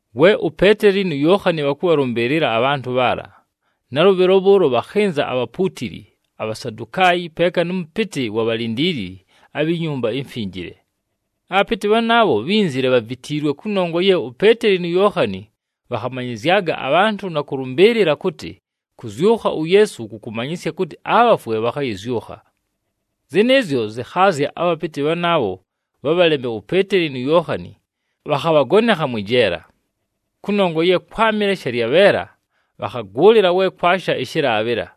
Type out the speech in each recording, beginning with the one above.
We uPeeteli nu Yookhani bhakʉbhalʉmbɨɨlɨla abhantʉ bhaala, nalʉbhɨlo bhʉʉlo bhakhɨnza abhapuutili, aBhasadukaayi, peeka nʉ mʉpɨtɨ ʉwa bhalindiilili abhi Nyumba iMfinjile. Abhapɨtɨ bhanaabho bhínzile bhavitiilwe kʉnongwa ye uPeeteli nu Yookhani bhakhamanyɨzyaga abhantʉ na kʉlʉmbɨɨlɨla kʉtɨ kʉzyʉkha uYeesu kʉkʉmanyɨsya kʉtɨ abhafwe bhakhayɨzyʉkha. Zɨnɨɨzyo zɨkhaazya abhapɨtɨ bhanaabho bhabhaleme uPeeteli nu Yookhani, bhakhabhagonekha mwɨ jeela. Kʉnongwa ye kwámɨle shalyabheela, bhakhagʉʉlɨla we kwasha ɨshɨlaabhɨla.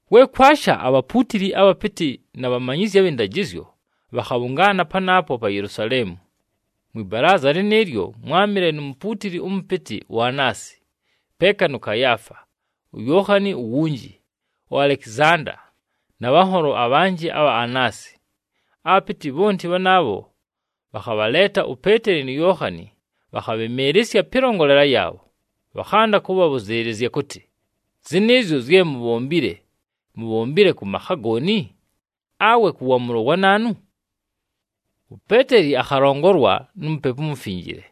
We kwasha abhapuutili, abhapɨtɨ na bhamanyizyi abhɨ ndajɨzyo bhakhabhʉngaana panaapo pa Yelusaleemu. Mwɨ balaaza lɨnɨɨlyo, mwámɨle nu mupuutili ʉmʉpɨtɨ uAanasi, peeka nʉ Kayaafa, uYookhani uwunji, uAlekizanda, na bhanholo abhanjɨ abha Aanasi. Abhapɨtɨ bhonti bhanaabho bhakhabhaleeta uPeeteli nu Yookhani, bhakhabhɨmɨɨlɨsya pɨlongolela yaabho, bhakhanda kʉbhabhʉzɨɨlɨzya kʉtɨ, “Zɨnɨɨzyo zye mubhombile, mubhombile kʉ makha gooni, awe kʉ waamʉlo wa naanu?” UPeeteli akhalongolwa nu Mupepu uMufinjile,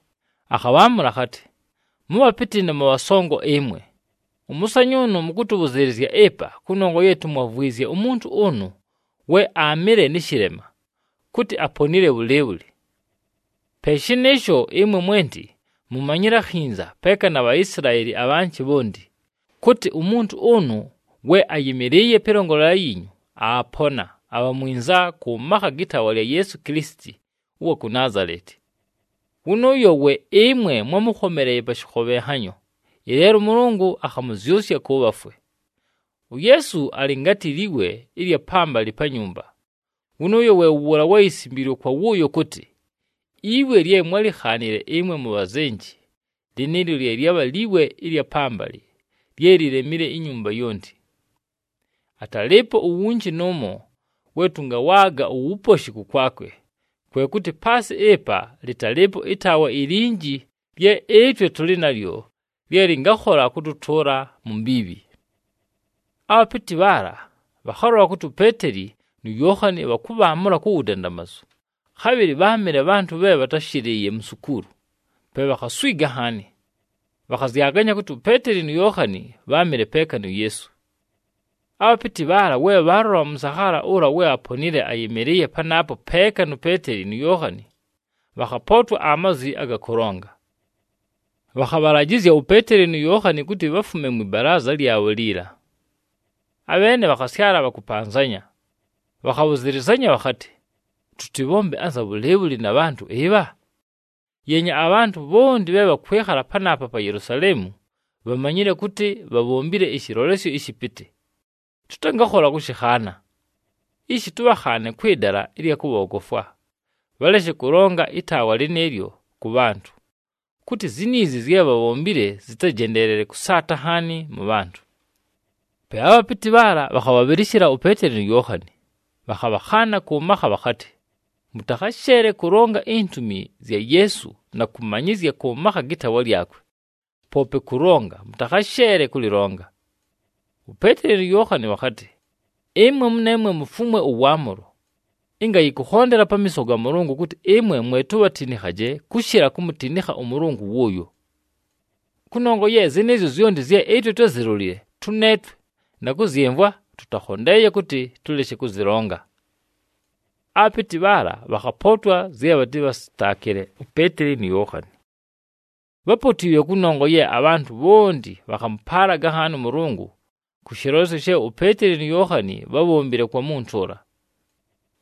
akhabhaamʉla akhatɨ, “Mʉbhapɨtɨ na mʉbhasongo ɨmwe! Ʉmʉsanyʉʉnʉ mʉkʉtʉbhʉzɨɨlɨzya ɨpa kʉnongwa ye tumwavwizye umuntu ʉnʉ we aamɨle nɨ shɨlema, kʉtɨ aponile bhʉlɨɨbhʉlɨ. Pe shɨnɨɨsho, ɨmwe mwenti mʉmanye akhinza, peeka na Bhaisilaeli abhanjɨ bhonti, kʉtɨ umuntu ʉnʉ we ayɨmɨlɨɨye pɨlongolela yiinyu, aapona, abha mwinza kʉ makha gɨ taawa lya Yeesu Kilisiti ʉwa ku Naazaleti. Wʉnʉʉyo we ɨmwe mwámʉkhomeleeye pa shɨkhobhenhanyo, ɨleelo ʉMʉlʉngʉ akhamʉzyʉsya kʉ bhafwe. UYeesu alɨ ngatɨ liwe ɨlya pambalɨ pa nyumba, wʉnʉʉyo we wʉ wʉʉla we yisimbiilwe kwa wʉʉyo kʉtɨ, ‘Iwe lye mwálikhaanile ɨmwe mubhazenji, lɨnɨɨlyo lye lyabha liwe ɨlya pambalɨ lye lilemile inyumba yonti.’ Atalɨɨpo uwunji nʉʉmo we tʉngawaaga uwuposhi kʉkwakwe, kwe kʉtɨ paasɨ ɨpa lɨtalɨɨpo ɨtaawa ilinji lye ɨtwe tʉlɨ nalyo lye lɨngakhola kʉtʉtʉʉla mu mbiibhi.” Abhapɨtɨ bhaala bhakhalola kʉtɨ uPeeteli nu Yookhani bhakʉbhaamʉla ku wudandamazu, khabhɨlɨ bháamɨle bhantʉ bhe bhatáshɨlɨɨye mu nsukuulu, pe bhakhaswiga nhaani. Bhakhazyaganya kʉtɨ uPeeteli nu Yookhani bháamɨle peeka nu Yeesu. Abhapɨtɨ bhaala we bhaalola ʉmʉsakhaala ʉla we aponile ayɨmɨlɨɨye panaapo peeka nu Peeteli nu Yookhani, bhakhapootwa amazwi aga kʉlonga. Bhakhabhalajɨzya uPeeteli nu Yookhani kʉtɨ bhafume mwɨ balaaza lyabho liila. Abheene bhakhasyala bhakʉpanzanya, bhakhabhʉzɨlɨzanya bhakhatɨ, “Tʉtɨbhombe anza bhʉlɨɨbhʉlɨ na bhantʉ ɨbha? Yeenya, abhantʉ bhonti bhe bhakwɨkhala panaapa pa Yelusaleemu bhamanyile kʉtɨ bhabhombile ɨshɨlolesyo ɨshɨpɨtɨ, tʉtangakhola kʉshɨkhaana. Ishi tʉbhakhaane kwɨ dala ɨlya kʉbhoogofwa, bhaleshe kʉlonga ɨtaawa lɨnɨɨlyo kʉ bhantʉ, kʉtɨ ziniizi zye bhabhombile zɨtajendeelele kʉsaata nhaani mʉ bhantʉ.” Pe abhapɨtɨ bhaala bhakhabhabhɨlɨshɨla uPeeteli nu Yookhani, bhakhabhakhaana kʉ makha bhakhatɨ, “Mʉtakhasheele kʉlonga intumi zya Yeesu na kʉmanyɨzya kʉ makha gɨ taawa lyakwe. Poope kʉlonga, mʉtakhasheele kʉlɨlonga!” UPeeteli nu Yookhani bhakhatɨ, “Ɨmwe mʉneemwe mufumwe ʉwaamʉlo, ɨnga yɨkʉkhondela pamiiso ga Mʉlʉngʉ kʉtɨ ɨmwe mwe tubhatinikhaje kʉshɨla kumutinikha ʉMʉlʉngʉ wʉʉyo. Kʉnongwa ye zɨnɨɨzyo zyonti zye ɨtwe twázilolile tʉneetwe, na kʉzyɨmvwa, tʉtakhondeeye kʉtɨ tʉleshe kʉzɨlonga.” Abhapɨtɨ bhaala bhakhapootwa zye bhatɨbhasɨtaakɨle uPeeteli nu Yookhani. Bhápotiilwe kʉnongwa ye abhantʉ bhonti bhakhamʉpaalaga nhaani ʉMʉlʉngʉ kʉ shɨlolesyo she uPeeteli nu Yookhani bhábhombile kwa muntu ʉla.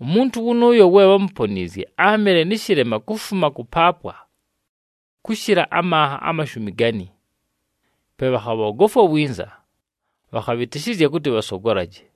Umuntu wʉnʉʉyo we bhámuponiizye áamɨle nɨ shɨlema kufuma kʉpaapwa kʉshɨla amanha amashumi gani. Pe bhakhabhoogofwa winza, bhakhabhɨtɨshɨzya kʉtɨ bhasogolaje.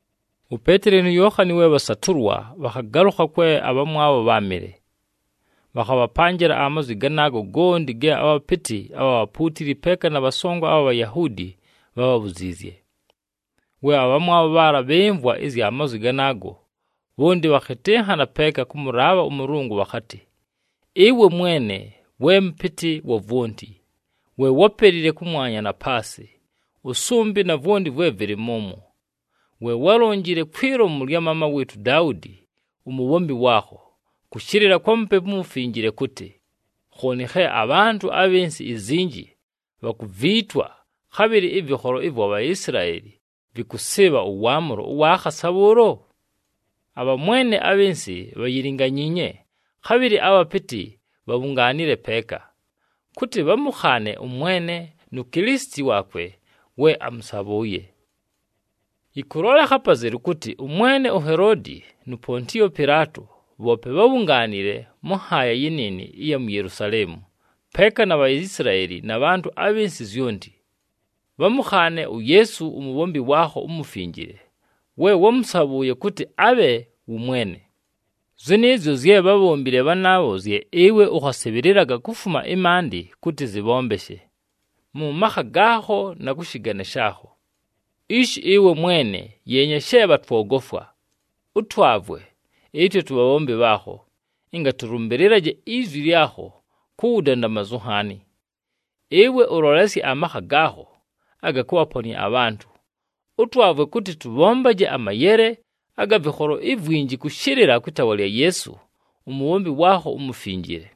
UPeeteli nu Yookhani, we bhasatʉlwa, bhakhagalʉkha kwe abhamwabho bháamɨle. Bhakhabhapanjɨla amazwi ganaago gonti ge abhapɨtɨ abha bhapuutili, peeka na bhasongo abha Bhayahuudi bhábhabhuziizye. We abhamwabho bhaala bhɨmvwa ɨzya mazwi ganaago, bhonti bhakhɨtɨnhana peeka kʉmʉlaabha ʉMʉlʉngʉ bhakhatɨ, “Ɨwe Mwene, we Mʉpɨtɨ wa vwonti. We wápelile kʉmwanya, na paasɨ, ʉsʉmbɨ, na vwonti vwe vɨlɨ mʉmwo. We wálonjile kwi lomu lya maama wɨɨtʉ uDaudi, umubhombi waakho, kʉshɨlɨla kwa Mupepu uMufinjile kʉtɨ, ‘Khooni khe abhantʉ abhɨ nsɨ izinji bhakuviitwa, khabhɨlɨ ɨvɨkholo ɨvwa Bhaisilaeli vɨkʉsɨɨbha ʉwaamʉlo ʉwa khasa bhʉʉlo? Abhamwene abhɨ nsɨ bhayilinganyiinye, khabhɨlɨ abhapɨtɨ bhabhungaanile peeka, kʉtɨ bhamʉkhaane ʉMwene nu Kilisiti waakwe we amʉsabhʉʉye.’ Yɨkʉlolekha apazelu kʉtɨ ʉmwene uHeloodi nu Pontiyo Pɨlaato bhoope bhábhungaanile mʉ nhaaya yɨnɨɨnɨ ɨya mu Yelusaleemu, peeka na Bhaisilaeli na bhantʉ abhɨ nsɨ zyonti, bhamʉkhaane uYeesu umubhombi waakho umufinjile, we wámʉsabhʉʉye kʉtɨ abhe wʉ Mwene. Zɨnɨɨzyo zye bhábhombile bhanaabho zye ɨwe ʉkhasɨbhɨlɨlaga kufuma ɨmaandɨ kʉtɨ zɨbhombeshe, mʉ makha gaakho na kʉ shɨgane shaakho. Ishi ɨwe Mwene, yeenya she bhatwogofwa! Ʉtwavwe, ɨtwe tubhabhombi bhaakho, ɨnga tʉlʉmbɨlɨlaje izwi lyakho ku wudandamazu nhaani. Ɨwe ʉlolesye amakha gaakho aga kʉbhaponɨa abhantʉ, ʉtwavwe kʉtɨ tʉbhombaje amayele aga vɨkholo ivwinji kʉshɨlɨla kwɨ taawa lya Yeesu, umubhombi waakho umufinjile.”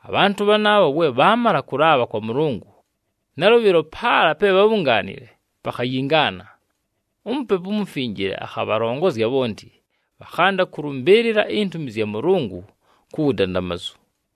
Abhantʉ bhanaabho we bhaamala kʉlaabha kwa Mʉlʉngʉ, nalʉbhɨlo paala pe bhábhungaanile pakhayingaana. UMupepu uMufinjile akhabhalongozya bhonti, bhakhanda kʉlʉmbɨɨlɨla intumi zya Mʉlʉngʉ ku wudandamazu.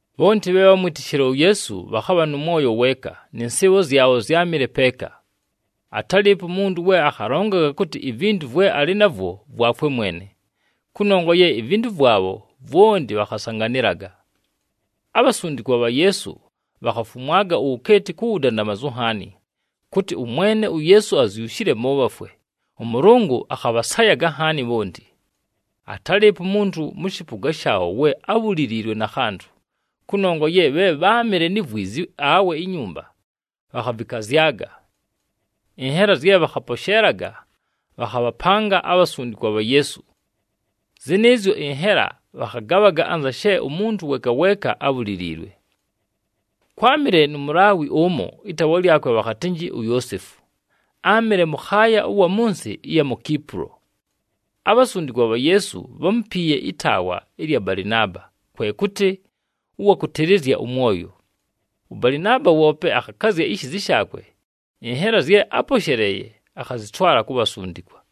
Bhonti bhe bhámwitishile uYeesu bhakhabha nʉ mwoyo weeka, nɨ nsɨɨbho zyabho zyámɨle peeka. Atálɨɨpo umuntu we akhalongaga kʉtɨ ivintu vwe alɨ navwo vwakwe mwene, kʉnongwa ye ivintu vwabho vwonti bhakhasanganɨlaga. Abhasundikwa bha Yeesu bhakhafumwaga uwukeeti ku wudandamazu nhaani, kʉtɨ ʉMwene uYeesu azyushile mʉ bhafwe, ʉMʉlʉngʉ akhabhasayaga nhaani bhonti. Atálɨɨpo umuntu mʉ shɨpʉga shaabho we ábhuliliilwe na khantʉ, kʉnongwa ye bhe bháamɨle ni vwizi awe inyumba, bhakhavɨkazyaga. Ɨnhela zye bhakhaposheelaga, bhakhabhapanga abhasundikwa bha Yeesu. Zɨnɨɨzyo ɨnhela bhakhagabhaga, anza she umuntu weeka weeka ábhuliliilwe. Kwámɨle nu Mulaawi ʉmo ɨtaawa lyakwe bhakhatɨnjɨ uYoosefu, áamɨle mʉkhaaya ʉwa mʉ nsɨ ɨya mu Kipulo. Abhasundikwa bha Yeesu bhámupiiye ɨtaawa ɨlya Balɨnaaba, kwe kʉtɨ, “Ʉwa kʉtɨlɨzya ʉmwoyo.” ɄBalɨnaaba woope akhakazya ishiizi shaakwe, ɨnhela zye áposheleeye, akhazɨtwala ku bhasundikwa.